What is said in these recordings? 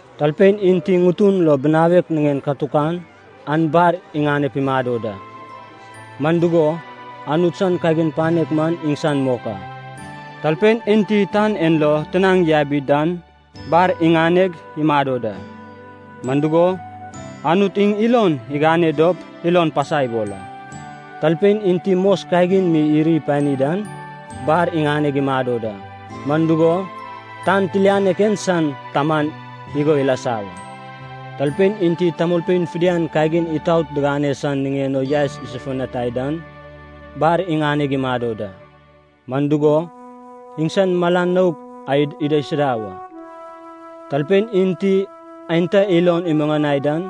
“Talpein enti ŋutun lo binawek niŋen katukan, an bar iŋaneg imado da. Man dugo, Anut san kagin panek man iŋsan mok a. Talpein enti tan en lo tinaŋ yabi dan, bar iŋaneg imado da. Man dugo, Anut iŋ ilon iŋane dop ilon pasa ibol a. Talpein enti mos kagin mi iri pani dan, bar iŋaneg imado da. Man dugo, tan tilianek en san taman igo ilasa wa. Talpein enti tamolpein fidian kagin itaot digane san niŋen o yaes isofutani dan, bar iŋaneg imado da. Man dugo, iŋsan mala nouk an idaisuda wa. Talpein enti aenta ilod imuŋanai dan,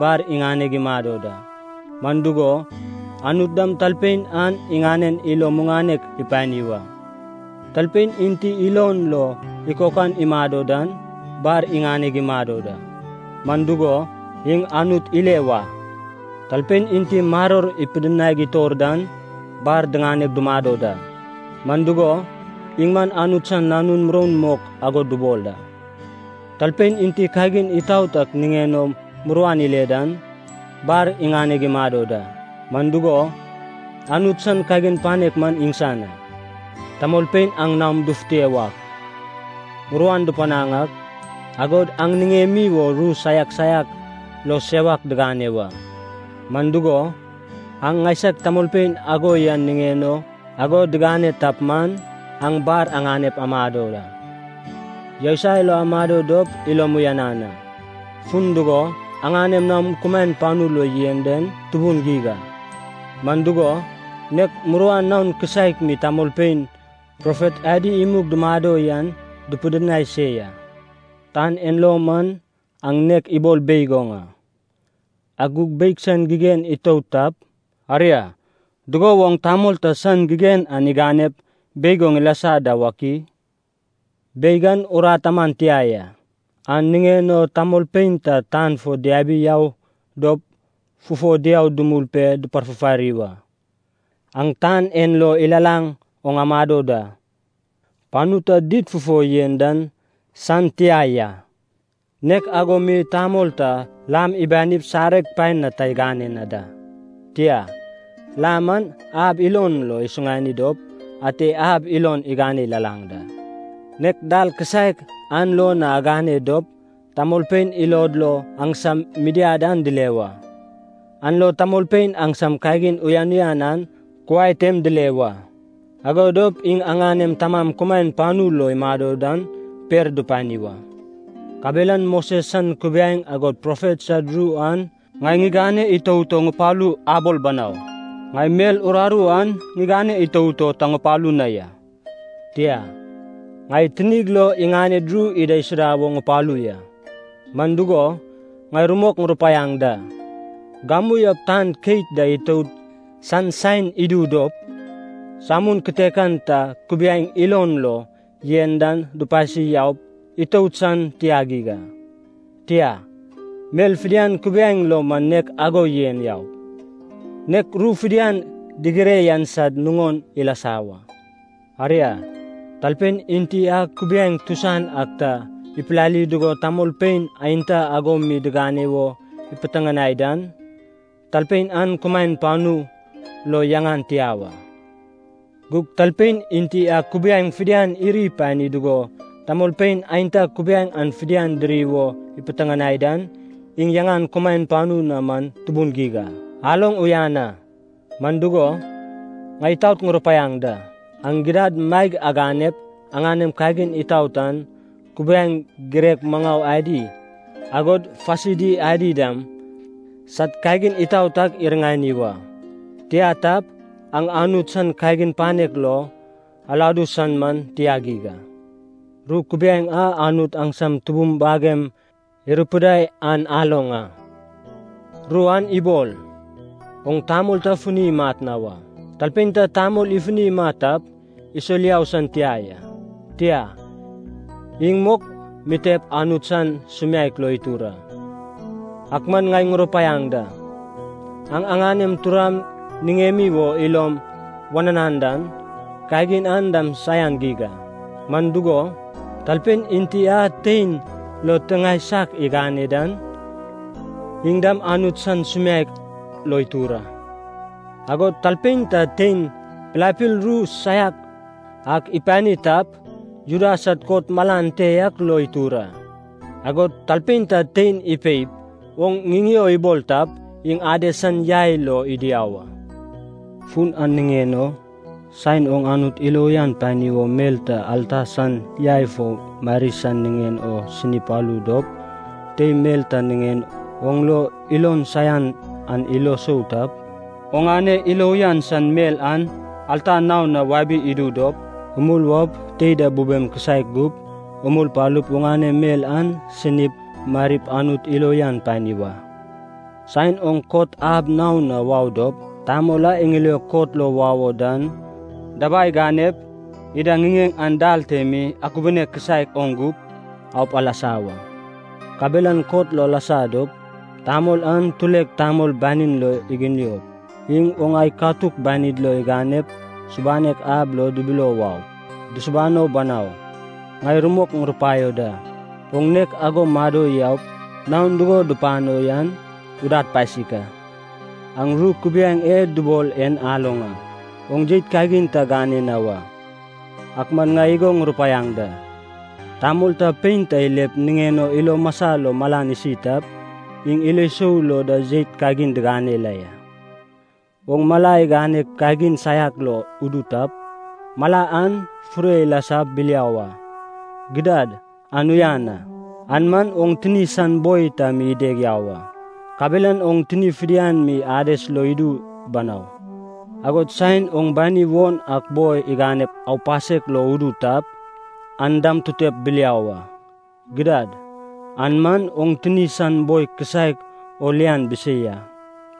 bar iŋaneg imado da. Man dugo, Anut dam talpein an iŋanen ilo muŋanek ipani wa. Talpein enti ilon lo ikokan imado dan, bar iŋaneg imado da. Man dugo, iŋ Anut ile wa. Talpein enti maror ipidinaig itor dan, bar diŋaneg dumado da. Man dugo, iŋ man Anut san nanun muroun mok ago dubol a. Talpein enti kagin itaot ak niŋen o muruan ile dan, bar iŋaneg imado da. Man dugo, Anut san kagin panek man iŋsan a. “Tamolpein aŋ naom dufute wak, muruan dupanaŋ ak, agod aŋ niŋemi wo ru saiak saiak lo sewak digane wa. Man dugo, aŋ ŋaisag tamolpein ago yan niŋen o ago digane tap man, aŋ bar aŋaneg amado da. Yousai lo amado dop ilom uyanan a, fun dugo, aŋanem naon kumaen panu lo yen den tubun geig a. Man dugo, nek muruan naon kisaek mi tamolpein profet adi imug dumado yan dupidinai se ya. “Tan en lo man aŋ nek ibol beig oŋ a. Ak gug beig san gigen itout tap, aria dugo woŋ tamol ta san gigen an iganep beig oŋ ilasa da wak i? Beig an urat aman tia ya, an niŋen o tamolpein tan fo diabi yau dop fufo diau dumul pe duparfufari wa. Aŋ tan en lo ilalaŋ oŋ amado da. Panu ta did fufo yen dan tamolpein dimiani san tia ya. Nek ago mi tamol ta lam ibanip sareg paen na ta igane na da. Tia, lam an ab ilon lo isuŋani dop ate ab ilon igane ilalaŋ da. Nek dal kisaek an lo na agane dop tamolpein ilod lo aŋsam midiad an dile wa, an lo tamolpein aŋsam kagin uyan uyan an kuai tem dile wa. Ago dop iŋ aŋanem Tamam kumaen panu lo imado dan per dupani wa. “Kabelan Moses san kubiaeŋ agod profet sad ru an ŋai ŋigane itout o ŋupalu abol banau. Ŋai mel uraru an ŋigane itout o ta ŋupalu na ya, tia, ŋai tinig lo iŋaned ru idaisuda wo ŋupalu ya. Man dugo, ŋai rumok ŋurupaiaŋ da, gamu yaup tan keit da itout san saen idu dop, samun kitekan ta kubiaeŋ ilon lo yen dan dupasi yaup itout san tia geig a. Tia, mel fidian kubiaeŋ lo man nek ago yen yaup, nek ru fidian digire yan sad nuŋon ilasa wa. Aria, talpein enti a kubiaeŋ tusan ak ta ipilali dugo tamolpein aenta ago mi digane wo ipiteŋanai dan, talpein an kumaen panu lo yaŋan tia wa. Gug talpein enti a kubiaeŋ fidian iri ipani dugo tamolpein aenta kubiaeŋ an fidian diri wo ipiteŋanai dan, iŋ yaŋan kumaen panu na man tubun geig a. Aloŋ uyan a, man dugo, ŋai itaot ŋurupaiaŋ da, aŋ gidad maeg aganep aŋanem kagin itaot an, kubiaeŋ girek maŋau adi, agod Fasidi adi dam, sad kagin itaot ak iriŋani wa. Tia tap, aŋ Anut san kagin panek lo aladu san man tia geig a. “Ru kubiaeŋ a Anut aŋsam tubum bagem irupidai an aloŋ a. Ru an ibol, ‘Oŋ tamol ta funi imat na wa. Talpein ta tamol ifuni imat tap, isol yau san tia ya, tia, iŋ mok mitep Anut san sumiaek lo itur a.’ Ak man ŋai ŋurupaiaŋ da, aŋ aŋanem turam niŋemi wo ilom wananan dan, kagin an dam saian geig a. Man dugo, talpein enti a tein lo tiŋae saiak igane dan, iŋ dam Anut san sumiaek lo itur a. Agod talpein ta tein pilapil ru saian ak ipani tap, Juda sad kot malan te yak lo itur a. Agod talpein ta tein ipeip ‘oŋ ŋiŋeo’ ibol tap, iŋ Ades san yai lo idu yau a. Fun an niŋen o, saen oŋ Anut ilo uyan pani wo mel ta alta san yai fo mari san niŋen o sini palu dop, tei mel ta niŋen oŋ lo ilon saian an ilo sou tap, oŋane ilo uyan san mel an alta naon na wabi idu dop, umul waup tei da bubem kisaek gup, umul palup oŋane mel an sinip marip Anut ilo uyan pani wa. Saen oŋ kot ab naon na wau dop, tamol a iŋiliog kot lo wau o dan, dabai ganep ida ŋiŋeŋ an dal te mi akubune kisaek oŋ gup aup alasa wa. Kabelan kot lo alasa dop, tamol an tulek tamol banin lo iginiop, iŋ oŋ ai katuk banid lo iganep, subanek ab lo dibilio waup, dusubano banau. Ŋai rumok ŋurupaio da, oŋ nek ago mado yaup naon dugo dupano yan udad pasik a. “Aŋ ru kubiaeŋ e dubol en aloŋ a, ‘Oŋ jeit kagin ta gane na wa.’ Ak man ŋai igo ŋurupaiaŋ da, tamol ta pein ta ilep niŋen o ilo masa lo malan isi tap, iŋ ilo sou lo da jeit kagin digane la ya. Oŋ mala iganep kagin saiak lo udu tap, mala an fure ilasap biliau a. Gidad, an uyan a, an man oŋ tini san boi ta mi ideg yau a, kabelan oŋ tini fidian mi Ades lo idu banau. Agod saen oŋ bani won ak boi iganep aupasek lo udu tap, an dam tutep biliau a. Gidad, an man oŋ tini san boi kisaek o lian bisei a,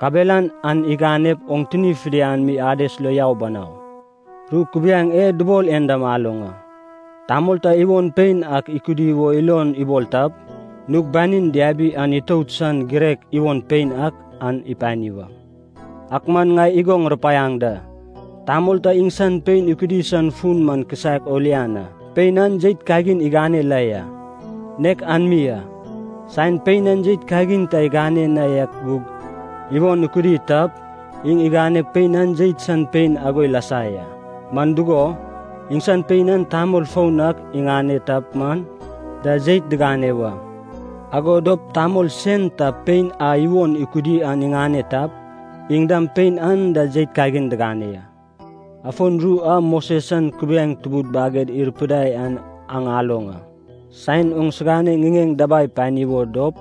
kabelan an iganep oŋ tini fidian mi Ades lo yau banau. “Ru kubiaeŋ e dubol en dam aloŋ a, ‘Tamol ta iwon pein ak ikudi wo ilon ibol tap, nug banin diabi an itout san girek iwon pein ak an ipani wa.’ Ak man ŋai igo ŋurupaiaŋ da, tamol ta iŋsan pein ikudi san fun man kisaek o lian a, pein an jeit kagin igane la ya, nek an mi a. Saen pein an jeit kagin ta igane na yak gug iwon ikudi tap, iŋ iganeg pein an jeit san pein ago ilasa ya. Man dugo, iŋsan pein an tamol foun ak iŋane tap man, da jeit digane wa. Ago dop tamol sen ta pein a iwon ikudi an iŋane tap, iŋ dam pein an da jeit kagin digane ya. “Afon ru a Moses san kubiaeŋ tubud baged irupidai an aŋ aloŋ a, ‘Saen oŋsigane ŋiŋeŋ dabai pani wo dop,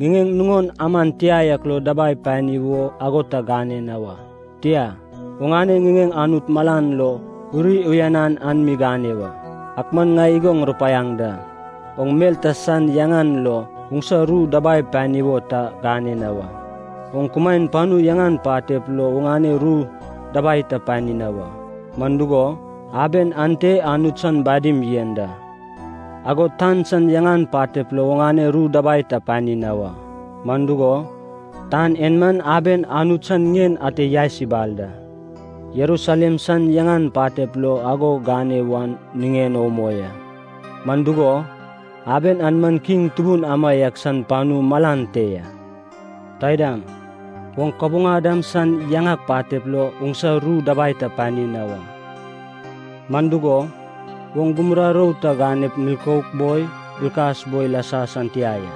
ŋiŋeŋ nuŋon aman tia yak lo dabai pani wo ago ta gane na wa. Tia, oŋane ŋiŋeŋ Anut malan lo uri uyanan an mi gane wa.’ Ak man ŋai igo ŋurupaiaŋ da, oŋ mel ta san yaŋan lo oŋsa ru dabai pani wo ta gane na wa. Oŋ kumaen panu yaŋan patep lo oŋane ru dabai ta pani na wa, man dugo, aben ante Anut san badim yen da. Agod tan san yaŋan patep lo oŋane ru dabai ta pani na wa, man dugo, tan en man aben Anut san ŋien ate yaes ibal da. Jerusalem san yaŋan patep lo ago gane wan niŋen o umoi a, man dugo, aben an man Kiŋ tubun amaiak san panu malan te ya. Taidam, oŋ kabuŋa dam san yaŋan patep lo oŋsa ru dabai ta pani na wa, man dugo, oŋ gumura roun ta ganep milkouk boi bilkas boi ilasa san tia ya.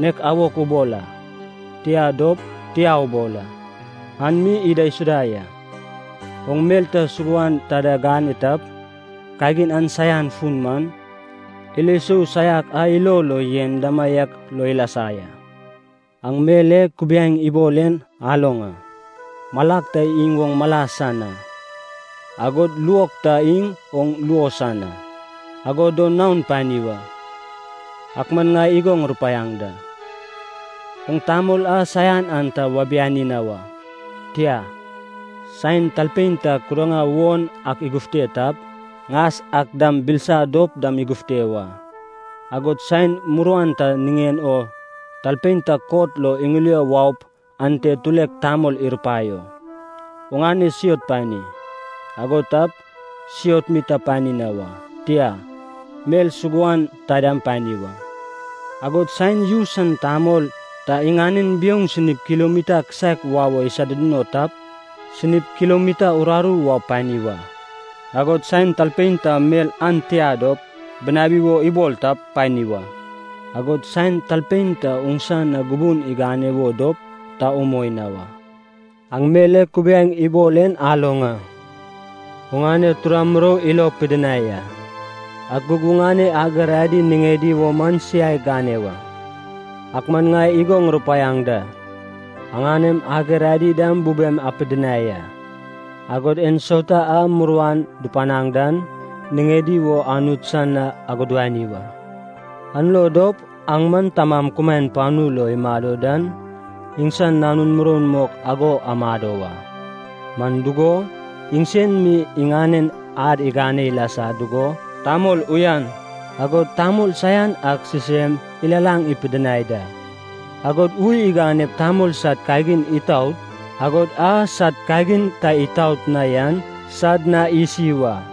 Nek ‘awok’ ubol a, tia dop, ‘tia’ ubol a, an mi idaisuda ya. Oŋ mel ta suguan taida gane tap, kagin an san fun man, ilo sou saiak a ilo lo yen damaiak lo ilasa ya. “Aŋ mel e kubiaeŋ ibol en aloŋ a, ‘Malak ta iŋ oŋ mala san a, agod luok ta iŋ oŋ luo san a, agodo naon pani wa.’ Ak man ŋai igo ŋurupaiaŋ da, oŋ tamol a saian an ta wabiani na wa. Tia, saen talpein ta kudaŋa won ak igufte tap, ŋas ak dam bilisa dop dam igufte wa. Agod saen muruan ta niŋen o talpein ta kot lo iŋilio waup ante tulek tamol irupaio, ‘oŋane siot pani.’ Ago tap, siot mi ta pani na wa, tia, mel suguan taidam pani wa. Agod saen yu san tamol ta iŋanen biouŋ sinip kilomita kisaek wau wo isoduduno tap, sinip kilomita uraru wau pani wa. Agod saen talpein ta mel an tia dop bunawi wo ibol tap, pani wa. Agod saen talpein ta oŋsa na gubun igane wo dop ta umoi na wa. “Aŋ mel e kubiaeŋ ibol en aloŋ a, ‘Oŋane tura murou ilo pidinai a, ak gug oŋane ager adi niŋedi wo man siai gane wa.’ Ak man ŋai igo ŋurupaiaŋ da, aŋanem ager adi dam bubem apidinai a. Agod ensauta a muruan dupanaŋ dan niŋedi wo Anut san na agudani wa. An lo dop aŋ man Tamam kumaen panu lo imado dan iŋsan nanun muroun mok ago amado wa. Man dugo, iŋsen mi iŋanen ad igane ilasa dugo tamol uyan, agod tamol saian ak sisem ilalaŋ ipidinai da, agod ui iganep tamol sad kagin itaot, agod a sad kagin ta itaot na yan, sad na isi wa.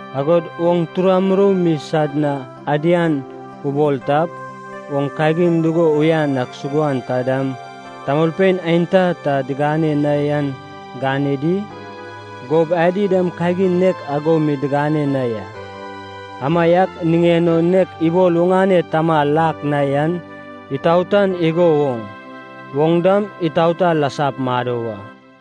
Agod oŋ tura murou mi sad na adian ubol tap, oŋ kagin dugo uyan ak suguan taidam tamolpein aenta ta digane na yan gane di? Gob adi dam kagin nek ago mi digane na ya. Amaiak niŋen o nek ibol oŋane Tama lak na yan itaotan igo woŋ, oŋ dam itaota lasap mado wa.